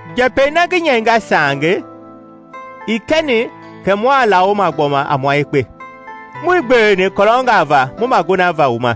Njɛpɛi na ngi nyɛinga saange ii kɛni kɛ mua lawoma gbɔma a mua yekpe. Muii gbeweni kɔlɔngaa va mu magonava wu ma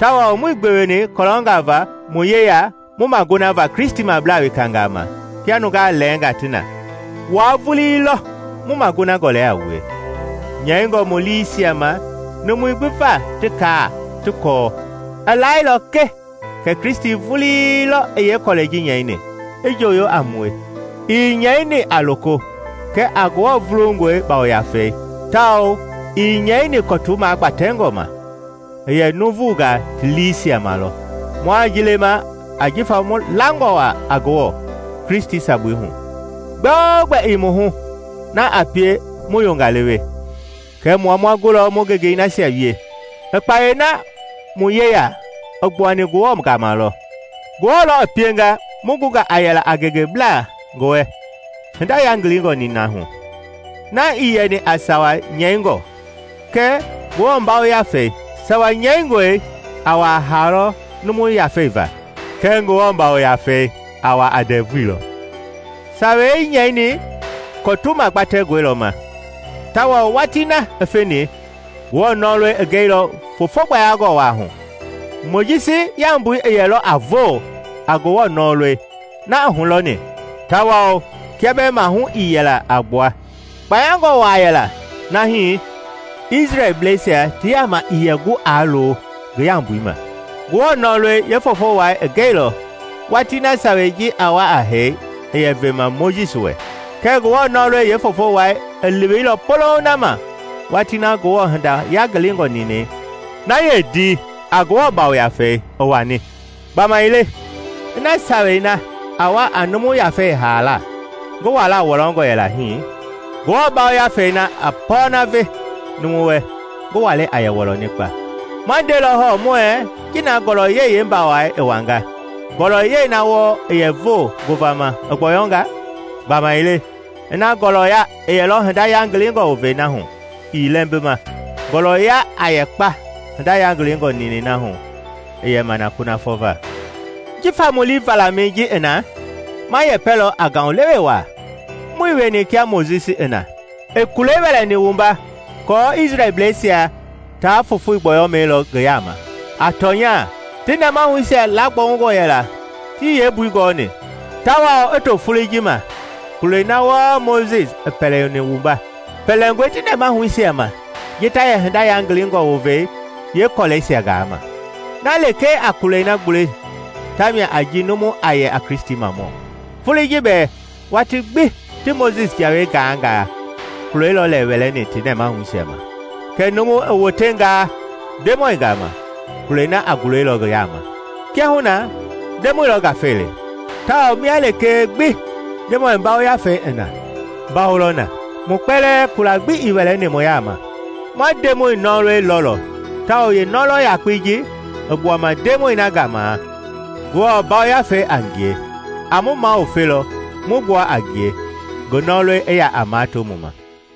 tawao muii gbeweni kɔlɔngaa va wu yeya mu magonava Kristimablaa wekangaa ma kia nungaa lɛɛngaa ti na. Wua vulii lɔ mu magona gɔlɛi a wue, nyɛingɔ mu liisia ma numui gbi va ti kaa ti kɔɔ. I laailɔ ke kɛ Kristi vulii lɔ i yeekɔlɛi ji nyɛini, i njooyo a mue. Ii nyɛini a loko kɛlee, kɛ Ngewɔ vulungɔi Yafei, tawao ii nyɛini kɔtu magbatɛngɔ ma, i yɛ nuuvungaa ti liisia ma lɔ. Mua ji lema ajifa mu langɔwa a Ngewɔ, Kristi sabui hu. Gbɛogbɛ i mu hu na a pie mu yongalewe, kɛ mua ma gulɔ mu gengei nasia wie. I kpayei na mu yeya i gbuani Ngewɔ gama lɔ; Ngewɔ lɔ i pienga mu gunga a yɛla a ngengeblaa ngi wɛ hinda yangilingɔ nina hu, na ii yɛni a sawa nyɛingɔ kɛ Ngewɔ Yafei. Sawa nyɛingɔi a wa a hee lɔ numu yafei va kɛɛ Ngewɔ Yafei a wa a ndɛvui lɔ. Sawei nyɛini kɔtu magbatɛngɔi lɔ ma, tawao watii na i feni, Ngewɔ nɔlɔi i gɛilɔ foofo gbayangɔ waa hu. Mojisi yaumbui i yɛlɔ a voo a Ngewɔ nɔlɔi na i hulɔni tawao kia bɛɛ mahu i yɛla a gbua, kpayangɔ waa yɛlɔ na hii i Isrɛlbleisia ti yaama ii yɛ gu aa lo ngi yaumbui ma. Ngewɔ nɔlɔi yeefoofo wai i gɛilɔ watii na Sawei ji a wa a hee i yɛ vema Mojisi wɛ, kɛ Ngewɔ nɔlɔi yeefoofo wai i leweilɔ polouŋ na ma watii na Ngewɔ hinda yangilingɔ ninɛi na yeendii a Ngewɔ Yafei i wani. Gbamaile ina Sawei na a wa a numu yafei haala ngi wala wɔlɔngɔ yɛla hii, Ngewɔ Yafei na a pɔɔna vɛ numu wɛ ngi walei a yɛ wɔlɔni kpa! Ma ndelɔ hɔɔ muɛɛ ji na ngɔlɔyɛi yeembawai i wanga, ngɔlɔyɛi na wɔɔ i yɛ voo ngovama i gbɔyɔnga. Gbamaile ina ngɔlɔya i yɛlɔ hinda yangilingɔ wovei na hu ii lɛmbima, ngɔɔlɔya a yɛ kpa hinda yangilingɔ ninɛi na hu i yɛma na kunafɔ va! Jifa mu lii valamɛi ji i na, ma yɛpɛlɔ a ngaulewe waa. Muii wieni kia Mojisi i na, i kulei wɛlɛni wumba aako Isrɛlbleisia taa fofoi gbɔyɔmɛi lɔ ngi yaama. A tɔnya ti nɛmahuisia laagbɔungɔ yɛla tii yeembui gɔɔni, tawao i to foloi ji vulii ma, kulei na wɔɔ Mojisi pɛlɛni wumba, pɛlɛngɔe ti nɛmahuisia ma ji ta yɛ hinda yangilingɔ wovei yeekɔlɛisia gaama. Na lekee a kulɛi na gbule tamia a ji numu a yɛ a Kristimamɔ. Foloi ji bɛɛ, watii gbi ti Mojisi Jawei gaangaa, kulei lɔ lɛ wɛlɛni ti nɛmahuisia ma. Kɛɛ numu i wotengaa Ndemɔi gama, kulei na a gulelɔ ngi yaama. Kiahuna, Ndemɔi lɔ Ngafei le; tawao mia lekee gbi Ndemɔi Yafei i na, mbawo lɔ na. Mu kpɛlɛɛ, kula gbi ii wɛlɛni mu yaama, ma Ndemɔi nɔlɔi lɔlɔ; tawao yeenɔlɔ yakpei ji i gbuama Ndemɔi na gama, Ngewɔ Yafei a ngie, a mu maluvelɔ mu gbua a ngie, ngi nɔlɔi i ya a mato mu ma.